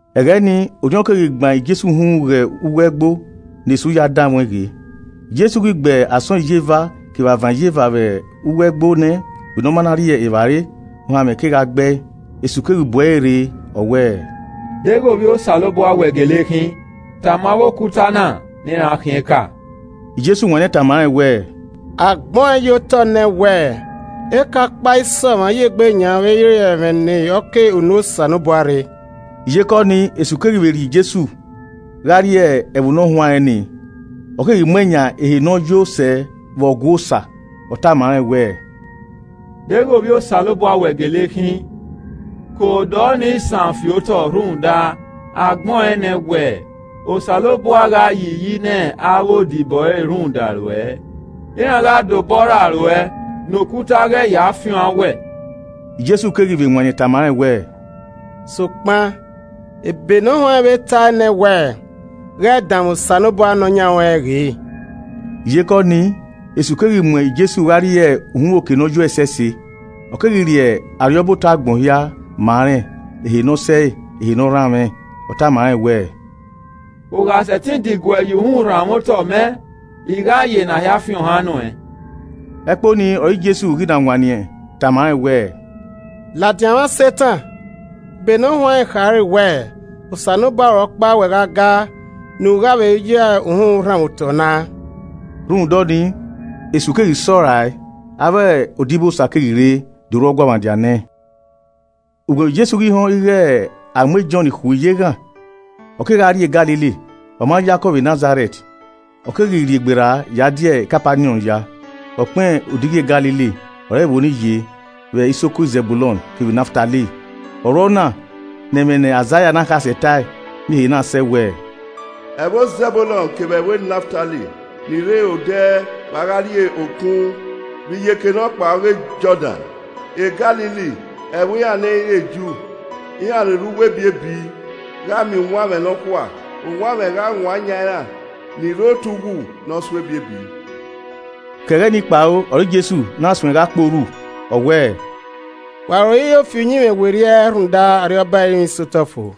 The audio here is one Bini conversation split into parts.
Ẹghẹ ni, Orhiọn keghi gban Jesu uhunmwu ghe uwu ẹgbo ne Esu ya danmwẹ ọẹn ghe. Jesu ghi gbe asọn iyeva kevbe avan iyeva vbe uwu ẹgbo nẹ, vbe ne ọ ma na rri evbare, ohanmwẹ kegha gbe ẹe. Esu keghi bu ẹre rre, ọ wẹẹ, “Deghẹ Ovbi Osanobua wẹ gele khin tama avbe okuta na ne iran khian eka.” Jesu wanniẹn tama rẹn wẹẹ, “Agbẹn ọẹn ye otọ nẹ wẹ, ‘Eka ọkpa i sẹ ọmwa ya egbe yan vbe ẹ i re ẹmwẹ ne ọ ke unu Osanobua rre.’” Iyeke ọnii, Esu keghi vbe rhie Jesu gha rrie ẹvbo Nọhuanrẹn ni, ọ keghi muẹn yan ehe ne ọ yo sẹ vbe Ọgua Osa. Ọ tama rẹn wẹẹ, “Deghẹ Ovbi Osanobua wẹ gele khin, ke odọ ni san fi otọ rhunmwuda a gbẹn ọẹn nẹ wẹẹ, ‘Osanobua gha yi iyi ne avbe odibo ẹre rhunmwuda ruẹ iran gha da obọ rra ruẹ, ne okuta ghẹ ya fian an owẹ.’” Jesu keghi vbe wanniẹn tama rẹn wẹẹ, “Sokpan ebe nọhuanrẹn vbe tae nẹ wẹẹ, ‘Ghẹ danmwẹ Osanobua Nọyaẹnmwa ruẹn ghe.’” Iyeke ọnii, Esu keghi mu Jesu gha rrie uhunmwu oke ne ọ yo ẹsẹse, ọ keghi rhie arriọba otọ agbọn hia ma rẹn, ehe ne ọ sẹe, ehe ne ọ rhanmwẹ, ọ tama rẹn wẹẹ, “U gha sẹtin diguẹ ya uhunmwu rhanmwẹ otọ mẹ, I gha ya ena hia fi ohan nuẹn.” Ẹkpo nii ọre Jesu ghi na wanniẹn tama rẹn wẹẹ, “Ladian mwa Setan, ebe nọhuanrẹn khare wẹẹ, ‘Osanobua ruẹ ọkpa wẹ gha gaa, ne u gha vbe ya uhunmwu rhanmwẹ otọ na.’” Rhunmwuda ọnii, Esu keghi sọrae, avbe odibosa keghi rre do ru ọguọmwadia nẹẹn. Ugbẹn vbe Jesu ghi họn ighe a mu e Jọn khui ye eghan, ọ kegha rrie Galili. Ọ ma yakọ vbe Nazarẹt, ọ keghi rhiegberra ya die Kapaniọn ya, ọkpẹn odighi e Galili ọre ẹvbo ni ye vbe isoko Zẹbulọn kevbe Naftali. Ọ ru ọna ne ẹmwẹ ne Aizaia ne akhasẹ tae miẹn ehe na sẹ wẹẹ, “Ẹvbo Zẹbulọn kevbe ẹvbo Naftali, ni rre odẹ vbe a gha rrie okun vbe iyeke nọkpa ọghe Jọdan, Galili, ẹvbo iran ne ẹ i re Ju! Iran ni rre uwu ebiebi, gha miẹn uwanmwẹ nọkhua. Uwanmwẹ gha wan yan iran, ni rre otọe uwu ne ọ so ebiebi.” Ke ẹghẹ ni kpao ọre Jesu na suẹn gha kporhu, ọ wẹẹ, “Wa ro iro fi uyinmwẹ werriẹ, rhunmwuda Arriọba ẹrinmwi sẹ otọ fo.”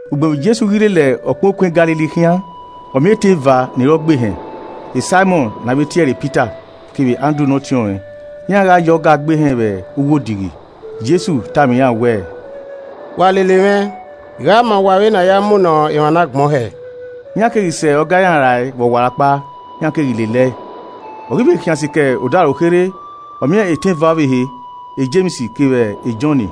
Ugbẹn vbe Jesu ghi lele ọkpẹn okun Galili khian, ọ miẹn etẹn eva ni re ọgbehẹn, Saimọn (ne a vbe tie ẹre Pita) kevbe Andru ne ọtiọnrẹn, iran gha ya ọga gbe ehẹn vbe uwu odighi. Jesu tama iran wẹẹ, “Wa lele mwẹ, I gha ma uwa vbene a ya munọ emwa nagbọn hẹ.” Iran keghi sẹ ọga iran rae vbe ọwarọkpa, iran keghi lele ẹe. Ọ ghi vbe khian sikẹ odaro kherhe, ọ miẹn etẹn eva ọvbehe, Jems kevbe Jọn ne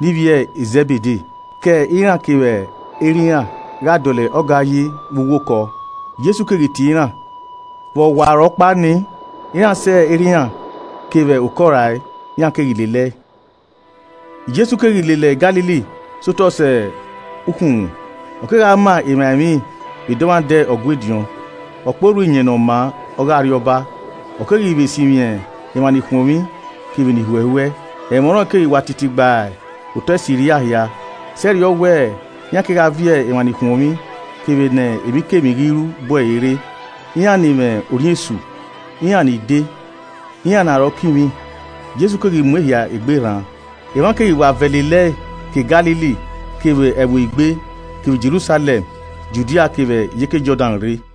ivbi e Zẹbede ke iran kevbe erha iran gha dọlọ ọga yi vbe uwu okọ. Jesu keghi tie iran. Vbe ọwarọkpa ni, iran sẹ erha iran kevbe okọ rae, iran keghi lele ẹe. Jesu keghi lele Galili sẹ otọ sẹ ukhunmwu, ọ kegha ma emwa emwi vbe dọmwadẹ Ọgua ediọn, ọ kporhu Iyẹn Ne ọ maa ọghe Arriọba, ọ keghi vbe sinmwi emwa nikhuọnmwi kevbe ni huẹhuẹ. Ẹmwẹ ọnrẹn keghi wa titi gba otọ Siria hia sẹrriọ wẹ iran kegha viọ emwa nikhuọnmwi kevbe ne emwikemwi ghi ru bu ẹre rre, iran ni mwẹ orhiọn esu, iran ni de, iran ne arọ kinmwi, Jesu keghi mu ehia egbe rran. Emwa keghi wa vẹ lele ẹe ke Galili kevbe Ẹvbo Igbe, kevbe Jerusalẹm, Judia, kevbe iyeke Jọdan rre.